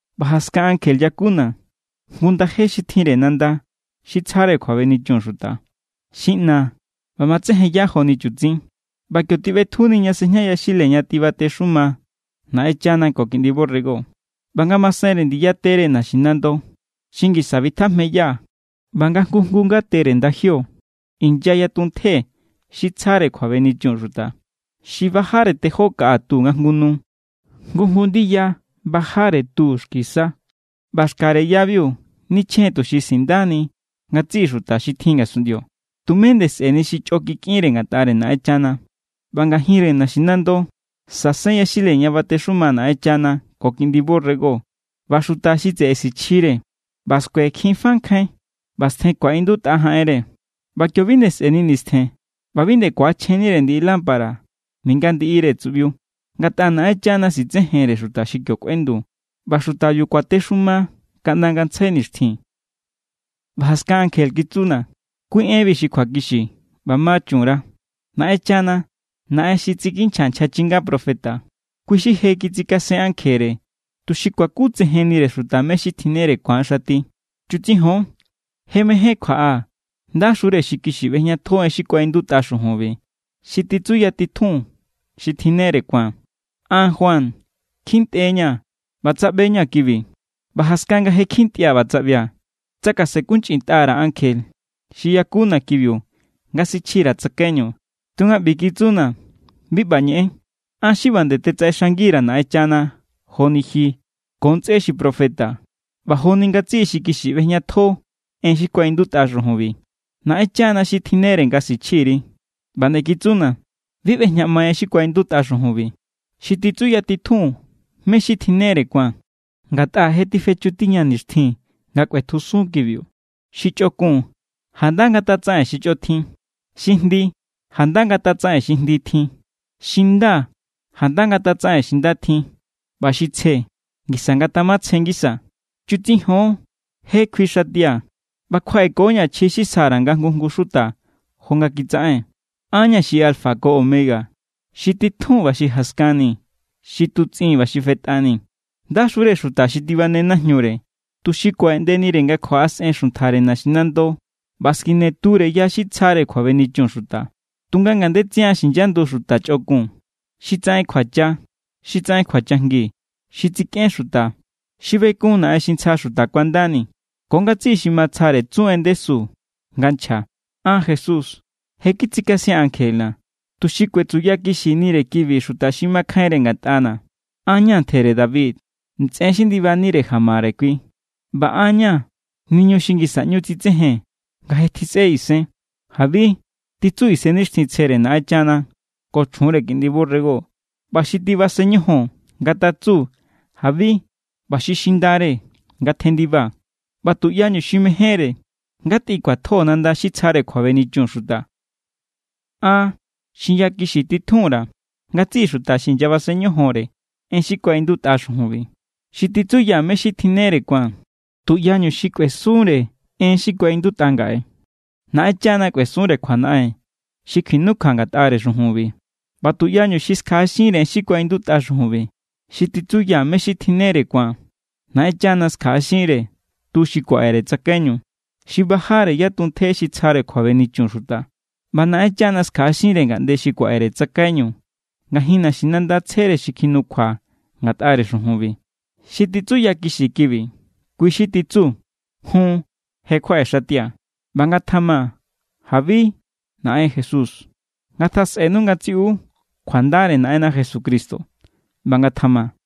ꞌBa jaskan ankje yakuna̱ jngu ndaje xi tjinre nanda xi tsjare kjuabenichun xuta. Xi ꞌna ꞌba matsejenya joni chutsin. ꞌBa kio tiꞌbetjuni ña sejña yaxile ña tibatexuma Naꞌenchana ko Kiꞌndi borrego. ꞌBa ngamasenre ndiya tere naxinando xi ngisa bitjajmeya ꞌba nga jngu jngu ngatere ndajio inya yatuntje xi tsjare kjuabenichun xuta. Xi bajare tejó kaꞌa tu nga jngu nu. Jngu jngu ndiya bajare tu xki sa. ꞌBa xkare yabiu nichjen= tuxi sindani ngatsiꞌi xuta xi tjin ngasunꞌndio. Tume nde sꞌe̱ni xi chꞌo kikꞌinre ngatꞌare Naꞌenchana. ꞌBa ngajinre naxinando sasen yaxile ña batexuma Naꞌenchana ko Kiꞌndi borrego, ꞌba xuta xi tseꞌe sichjire. ꞌBa skuekjin fa nkjain ꞌba stjen ku̱aꞌindutꞌa jaꞌenre. ꞌBa kio bi nde sꞌe̱ni nistjen ꞌba bi nde ku̱achjennire ndiꞌi lámpara ninga ndiꞌire tsuꞌbiu, ngatꞌa Naꞌenchana sitsejenre xuta xi kio kꞌuendu. ꞌBa xutabiu kuatexuma kaꞌnda ngantsjai nixtjin. ꞌBa jaskan ankje kitsuna̱: “Kui enbi xi kjuakixi ꞌba ma chun_ra. Naꞌenchana, Naꞌen xi tsikinchja nchja chinga profeta, kui xi je kitsikasen ankjere, tuxi kuakutsejennire xutare mé= xi tjinnere ku̱an xati.” “Chutsijon. ¡Je mején kjuaꞌaa̱! ¡Ndaxure xi kixi ꞌbejñatjo en xi kuaꞌindutꞌa xujunbi, xi titsuyatitjun xi tjinnere ku̱an!” An, Juan, kjintꞌe=ña̱ ꞌba tsaꞌbe=ña̱ kibi. ꞌBa jaskan nga je kjintꞌia̱ ꞌba tsaꞌbia̱, tsakasenkunchꞌintꞌa_ra̱ ankje xi yakuna̱ kibiu nga sichji_ra̱ tsakaiñu. Tunga ꞌbi kitsuna̱: “Bi ꞌba ñeꞌen. An= xi ꞌba nde tetsaꞌexang_ra̱ Naꞌenchana joni ji ko ntsꞌé xi profeta ꞌba joni ngatsiꞌi xi kixi ꞌbejñatjo en xi kuaꞌindutꞌa xujunbi. Naꞌenchana xi tjinnere nga sichji_ri.” ꞌBa nde kitsuna̱: “Bi ꞌbejñaꞌmai en xi kuaꞌindutꞌa xujunbi, xi titsuyatitjun mé= xi tjinnere ku̱an, ngatꞌa je tifechu tiña nixtjin nga kꞌuetjusun kibiu. Xi chꞌokun, janda ngatatsaꞌen xi chꞌo tjin. Xi jndi, janda ngatatsaꞌen xi jndi tjin. Xi nda, janda ngatatsaꞌen xi nda tjin. ꞌBa xi tsje, ngisa ngatjamatsje ngisa.” “Chutsijon, je kjuixatia̱. ꞌBa kjuaꞌeko=ña̱ chji xi sja_ra̱ nga jngu jngu xuta jo nga kitsaꞌen. An= ña̱ xi alfa ko omega, xi titjun ꞌba xi jaskanni, xi tutsꞌin ꞌba xi fetꞌani.” ¡Ndaxure xuta xi tibane najñure, tuxi kuaꞌeꞌndenire nga kjuaꞌasꞌen xuntjare naxinando ꞌba skine ture ya xi tsjare kjuabenichun xuta! Tunga ngandetsian xinyandu xuta chꞌokun, xi tsaꞌen kjuacha, xi tsaꞌen kjuachajngi, xi tsikꞌen xuta, xi bekun naꞌen xi ntsja xuta kuandani, ko ngatsiꞌi xi matsjare tsu en ndesu nga nchja. “An, Jesús, je kitsikasia̱n ankjena̱, tuxi kuetsuyakixinire kibi xuta xi makjainre ngatꞌana̱. An= ña̱ ntjere David, ntsꞌen xi ndibanire jamare kui, ꞌba an= ña̱ niñu xi ngisa ꞌñu tsitsejen nga je tjisꞌe isen.” “¡Jabi!”, titsu Isennixtjintsjere Naꞌenchana ko chjunre Kiꞌndi borrego. ꞌBa xi tibasen ñojon ngatatsu: “¡Jabi!” ꞌBa xi xindare ngatjendiba, ꞌba tuꞌyañu xi mejénre ngatꞌikjuatjo nanda xi tsjare kjuabenichun xuta. An xinyakixi titjun_ra̱ ngatsiꞌi xuta xi inyabasen ñojonre en xi kuaꞌindutꞌa xujunbi, xi titsuya mé= xi tjinnere ku̱an: Tuꞌyañu xi kꞌuesunre en xi kuaꞌindutꞌa ngaꞌe, Naꞌenchana kꞌuesunre kjuanaꞌen xi kjinukjua ngatꞌare xujunbi. ꞌBa tuꞌyañu xi skjaꞌaxinre en xi kuaꞌindutꞌa xujunbi, xi titsuya mé= xi tjinnere ku̱an, Naꞌenchana skjaꞌaxinre tu xi kuaꞌere tsakaiñu, xi bajare yatuntje xi tsjare kjuabenichun xuta. ꞌBa Naꞌenchana skjaꞌaxinre ngaꞌnde xi kuaꞌere tsakaiñu ngajin naxinanda tsjere xi kjinukjua ngatꞌare xujunbi. Xi titsuyakixi kibi, kui= xi titsu: “Jun, je kjuaꞌexatia̱.” ¡ꞌBa ngatjama! ¡Jabi, Naꞌen Jesús! Ngatjasꞌenu ngatsiꞌu kjuandare Naꞌenna Jesucristo. ꞌBa ngatjama.